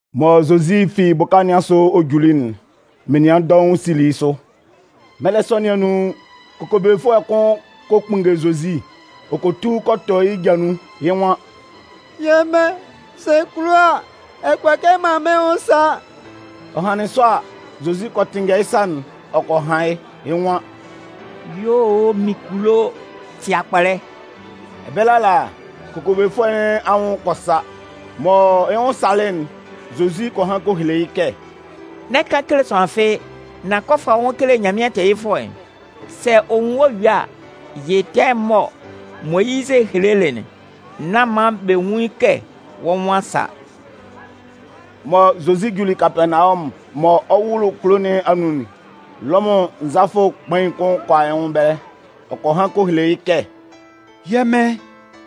Mɔ Zozi fi bʋka nɩn asʋ ɔ juli'n, menian dɔʋn sili yɩ́ sʋ. Mɛlɛ sɔ nɩn anun, kokobefʋɛ kʋn kɔ kpunnge Zozi, ɔ kɔ tu kɔ tɔ yɩ́ ja nun, yɩ́ nwan: “Yɛ́ Mɩn, sɛ ɛ kulo a, ɛ kʋala kɛ ɛ man mɩ́n nwʋn sa.” Ɔ hanlɩn sɔ a, Zozi kɔ tɩnngɛ yɩ́ sa'n ɔ kɔ han yɩ́. Yɩ́ nwan: “Yuo o, mɩn kulo, tɩ akpɔlɛ.” Ɛbɛlɛ ala, kokobefʋɛ nɩn anwʋn kɔ sa. Mɔ yɩ́ nwʋn salɩ'n, Zozi kɔ han kɔ hele yɩ́ kɛ: “N'ɛ kan kele sʋanlan fɩ́ɩ́, nan kɔ fa wɔ́ nwʋn kele Nyanmɩan tɛɛyɩfʋɛ'n. Sɛ ɔ nwun wɔ́ yue a, yɩ tɛɛ'n mɔ Moyizɩ helelɩ'n, nán man bɛ nwún yɩ́ kɛ wɔ́ nwʋn a sa.” Mɔ Zozi juli Kapɛɛnawɔmʋn mɔ ɔ 'wʋlʋ kulo nɩn anun'n, Lɔmʋn nzalafʋ kpain'n kʋn kɔ a yɩ́ nwʋn ɛbɛlɛ ɔ kɔ han kɔ hele yɩ́ kɛ: “Yɛ́ Mɩn,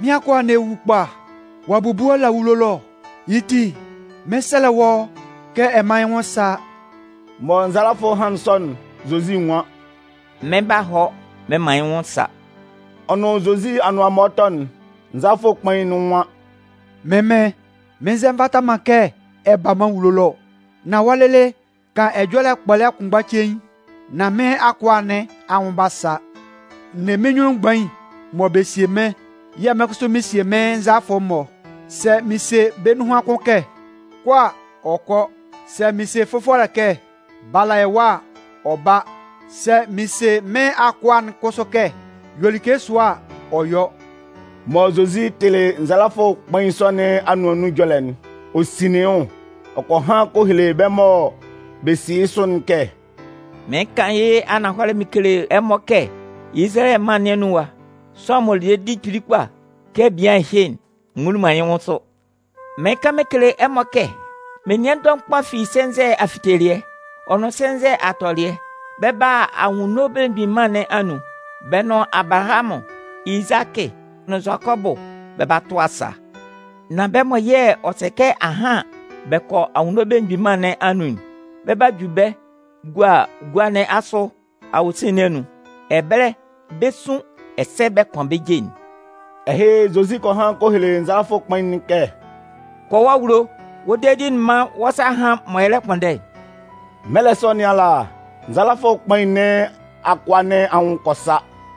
mɩ́n akʋa'n lɛ wu kpa. Ɔ'a bubu ɔ la awulo ɛlɔ. Yɩ́ ti, mɩn 'sɛlɛ wɔ́ kɛ ɛ mán yɩ́ nwʋn sá.” Mɔ nzalafʋ'n hanlɩn sɔ'n, Zozi nwan: “Mɩn 'ba hɔ mɩn man yɩ́ nwʋn sa.” Ɔ nʋn Zozi anʋan mɔ ɔ 'tɔ'n, nzalafʋ kpain'n nwan: “Mɩ́n Mɩn, mɩn nzɛ nvata man kɛ ɛ ba mɩ́n awulo ɛlɔ ɔ. Nan wɔ́ lɩlɩ kan ɛjɔlɛ kpɔlɛ kʋnmgba cein, nán mɩ́n akʋa nɩn anwʋn 'ba sa. N ne mɩ́n nyunnun mgbain mɔ bɛ sie mɩ́n yɛ̂ mɩ́n kʋsʋ mɩn sie mɩ́n nzalafʋ'n-mɔ. Sɛ mɩn se bɛ́ nunhan kʋn kɛ: ‘Kɔ!’ a, ɔ kɔ. Sɛ mɩn se fʋfɔlɛ kɛ: ‘Bala ɛwa!’ a, ɔ ba. Sɛ mɩn se mɩ́n akʋa'n kʋsʋ kɛ: ‘Yɔ like sʋa!’ a, ɔ yɔ.” Mɔ Zozi tɩlɩ nzalafʋ kpain sɔ nɩn anʋan nun ɛjɔlɛ'n, ɔ sinlin yɩ́ nwʋn. Ɔ kɔ han kɔ hele bɛ́ mɔ bɛ si yɩ́ sʋ'n kɛ: “Mɩɩn kan yɩ́ ananhɔlɛ mɩn kele ɛmɔ kɛ Izalayɛ mân nɩn anun ɛwa, sʋanlan m'ɔ le dedi kpili kpa kɛ bian ɛhɩ'n, n nwunlin man yɩ́ nwʋn sʋ. Mɩɩn kan mɩn kele ɛmɔ kɛ menian dɔʋn kpa fi sɛnzɛ afitelɩɛ, ɔ nʋn sɛnzɛ atɔlɩɛ, bɛ 'ba a Anwunno Belemgbin Mân nɩn anun, bɛ nʋn Abalahamʋn, Izakɩ, nʋn Zʋakɔbʋ bɛ 'ba tʋ asaa. Nan bɛ́ mɔ yɛ̂ ɔ sɛ kɛ ahan bɛ kɔ Anwunno Belemgbin Mân nɩn anun'n, bɛ 'ju bɛ́ bɛ gua gua nɩn asʋ awosin nɩn anun. Ɛbɛlɛ, bɛ 'sun, ɛsɛ bɛ 'kʋan bɛ́ je'n.” Ɛhɩ, Zozi kɔ han kɔ hele nzalafʋ kpain'n kɛ: “Kɔ wɔ́ awulo, wɔ́ dedi'n mán wɔ́ sa hán mɔ ɛ lɛ kpʋnndɛ'n.” Mɛlɛ sɔ nɩn ala, nzalafʋ kpain nɩn akʋa nɩn anwʋn kɔ sa.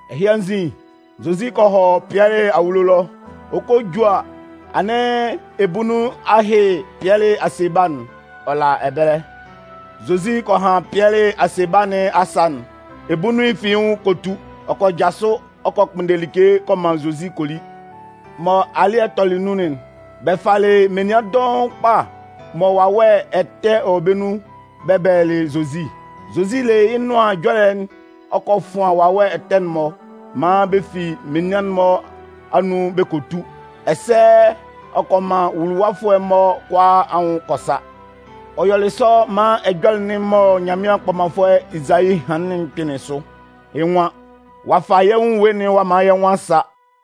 Ɛhɩ anzin, Zozi kɔ hɔ Pɩɛlɩ awulo ɛlɔ. Ɔ 'kɔ a ju a, anɩn ebunnun a hyɩ Pɩɛlɩ asebala'n, ɔ la ɛbɛlɛ. Zozi kɔ han Pɩɛlɩ asebala nɩn asa'n, ebunnun'n fi yɩ́ nwʋn kɔ tu. Ɔ kɔ jasʋ, ɔ kɔ kpʋnndɛ like kɔ man Zozi kɔ li. Mɔ alɩ́ɛ'n tɔlɩ nun'n, bɛ falɩ menian dɔʋn kpa mɔ wawɛ ɛtɛ wɔ bɛ́ nun bɛ bɛlɛlɩ Zozi. Zozi le yɩ́ Nʋan Ɛjɔlɛ'n ɔ kɔ fʋan wawɛ ɛtɛ'n-mɔ maan bɛ fi menian'n-mɔ anun bɛ kɔ tu. Ɛsɛ ɔ kɔ man nwuluwafʋɛ'n-mɔ kʋalaa anwʋn kɔ sa. Ɔ yɔlɩ sɔ maan ɛjɔlɛ'n mɔ Nyanmɩan kpɔmanfʋɛ Ezayi hanlɩn'n kpɩnlɩn sʋ. Yɩ́ nwan: Ɔ'a fa yɛ́ nwʋn ewue'n ɔ'a man yɛ́ nwʋn a sa.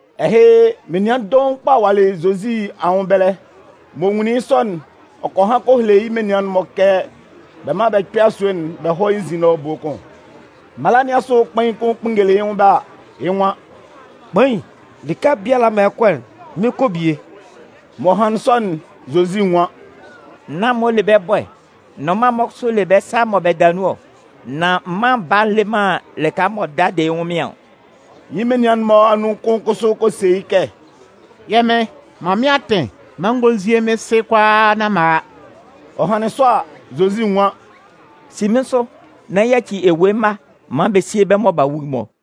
Ɛhɩ, menian dɔʋn kpa walɩ yialɩ Zozi anwʋn ɛbɛlɛ. M'ɔ nwunlin yɩ́ sɔ'n, ɔ kɔ han kɔ hele yɩ́ menian'n-mɔ kɛ bɛ mán bɛ kpɛ́ asue'n bɛ hɔ́ yɩ́ nzin ɛlɔ ebue kʋn. Mala nɩn asʋ kpain'n kʋn kpunngelɩ yɩ́ nwʋn ɛbɛlɛ a, yɩ́ nwan: “Kpain, lɩka biala mɔ ɛ 'kɔ'n, mɩn 'kɔ bie.” Mɔ hanlɩn sɔ'n, Zozi nwan: “Naan'n-mɔ le bɛ́ bɔɛ, nnʋnman'n-mɔ kʋsʋ le bɛ́ sâ mɔ bɛ da nun ɔ. Nan Mân Baa'n le man lɩka m'ɔ da de yɩ́ ɛnwʋnmɩan ɔ.” Yɩ́ menian'n-mɔ anun kʋn kʋsʋ kɔ se yɩ́ kɛ: “Yɛ́ Mɩn, man mɩ́n atɩn maan n gɔ́ n zíe mɩ́n sɩ kʋalaaka nán m'an a.” Ɔ hanlɩn sɔ a, Zozi nwan: “Si mɩ́n sʋ nán yaci ewue mma maan bɛ síe bɛ́ mɔ b'a wu'n-mɔ.”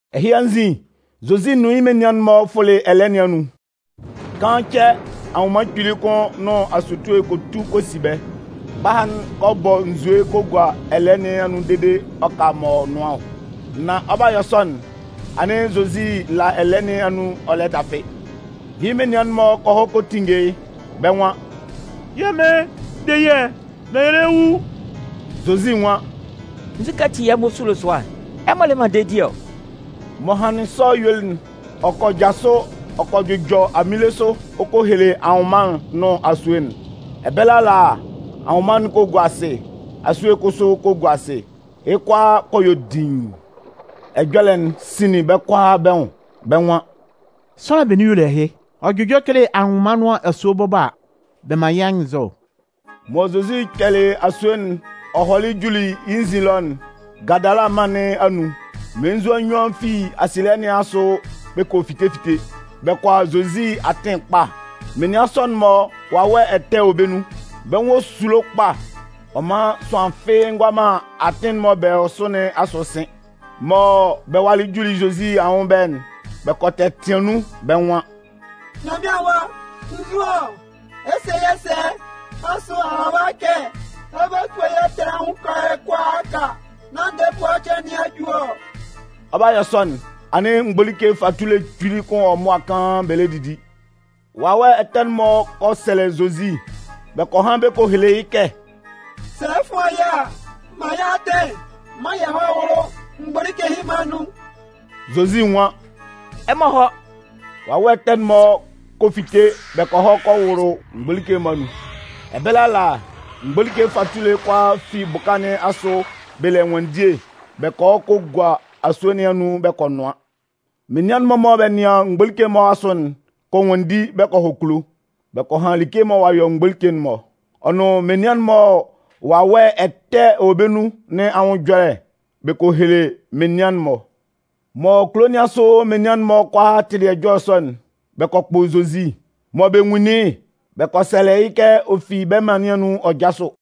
Ɛhɩ anzin, Zozi nʋn yɩ́ menian'n-mɔ fʋlɩ ɛlɛɛ nɩn anun. Kaan cɛ, anwʋnman kpili kʋn nʋn asutue kɔ tu kɔ si bɛ́. Mgbaha'n kɔ bɔ nzue kɔ gua ɛlɛɛ nɩn anun dede ɔ ka m'ɔ nʋan ɔ. Nan ɔ 'ba yɔ sɔ'n, anɩn Zozi la ɛlɛɛ nɩn anun ɔ lɛ dafɩ. Yɩ́ menian'n-mɔ kɔ hɔ kɔ tinnge yɩ́. Bɛ́ nwan: “Yɛ́ mɩn, de yɛ́ nán yɛ lɛ wu!” Zozi nwan: “Nzukɛ ati yɛ̂ ɛmɔ sulo sʋa'n? Ɛmɔ le man dedi ɔ?” M'ɔ hanlɩn sɔ yuelɩ'n, ɔ kɔ jasʋ ɔ kɔ jʋjɔ aminle sʋ ɔ kɔ hele anwʋnman'n nʋn asue'n. Ɛbɛlɛ ala, anwʋnman kɔ gua asɩ, asue kʋsʋ kɔ gua asɩ. Yɩ́ kʋalaa kɔ yɔ diin. Ɛjɔlɛ'n sinlin bɛ́ kʋalaa bɛ́ nwʋn. Bɛ́ nwan: “Sʋanlan benin y'ɔ le ɛhɩ? Ɔ jʋjɔ kele anwʋnman nʋn asue bɔbɔ a, bɛ man yɩ́ anyɩnnzɔ!” Mɔ Zozi kpɛlɩ asue'n ɔ hɔlɩ juli yɩ́ nzin ɛlɔ'n, Gadala mân nɩn anun, mmelenzua nnyuan fi asielɩɛ nɩn asʋ bɛ kɔ fite fite. Bɛ kɔ a Zozi atɩn ɛkpa. Menian sɔ'n-mɔ, wawɛ ɛtɛ wɔ bɛ́ nun. Bɛ́ nwʋn esulo kpa, ɔ man sʋanlan fɩ́ɩ́ ngʋala man atɩn'n mɔ bɛ wɔ sʋ nɩn asʋ sɩn. Mɔ bɛ walɩ juli Zozi anyunnun ɛbɛlɛ'n, bɛ kɔ tɛtɩan nun. Bɛ́ nwan: “Nyanmɩan Awa, nzu ɔ? Ɛ se yɛ́ sɛ? Asʋ a a ɛwa kɛ ɛ 'ba tua yɛ́ ɛtɛ nɩn anwʋn kalɛ kʋalaaka nán ndɛɛ ebua cɩan nɩn a ju ɔ?” Ɔ 'ba yɔ sɔ'n, anɩn mgbolike fatule kpili kʋn wɔ mʋa kaan bɛ lɛ didi. Wawɛ ɛtɛ'n-mɔ kɔ sɛlɛ Zozi, bɛ kɔ han bɛ kɔ hele yɩ́ kɛ: “Sɛ ɛ 'fʋan yɛ́ a, man yɛ́ atɩn maan yɛ hɔ́ wʋ́lʋ mgbolike ɛhɩ-mɔ anun.” Zozi nwan: “Ɛmɔ hɔ́!” Wawɛ ɛtɛ'n-mɔ kɔ fite bɛ kɔ hɔ kɔ wʋlʋ mgbolike'n-mɔ anun. Ɛbɛlɛ ala, mgbolike fatule'n kʋalaa fi bʋka nɩn asʋ bɛ le ɛnwanndie bɛ kɔ hɔ kɔ gua asue nɩn anun bɛ kɔ nʋan. Menian'n-mɔ mɔ bɛ nɩan mgbolike'n-mɔ asʋ'n kɔ nwanndi bɛ kɔ hɔ kulo, bɛ kɔ han like'n mɔ ɔ'a yɔ mgbolike'n-mɔ, ɔ nʋn menian'n-mɔ mɔ wawɛ ɛtɛ wɔ bɛ́ nun nɩn anwʋn ɛjɔlɛ bɛ kɔ hele menian'n-mɔ. Mɔ kulo nɩn asʋ menian'n-mɔ kʋalaa tɩlɩ ɛjɔlɛ sɔ'n, bɛ kɔ kpʋ Zozi. Mɔ bɛ nwunlin yɩ́'n, bɛ kɔ sɛlɛ yɩ́ kɛ ɔ fi bɛ́ mân nɩn anun ɔ jásʋ.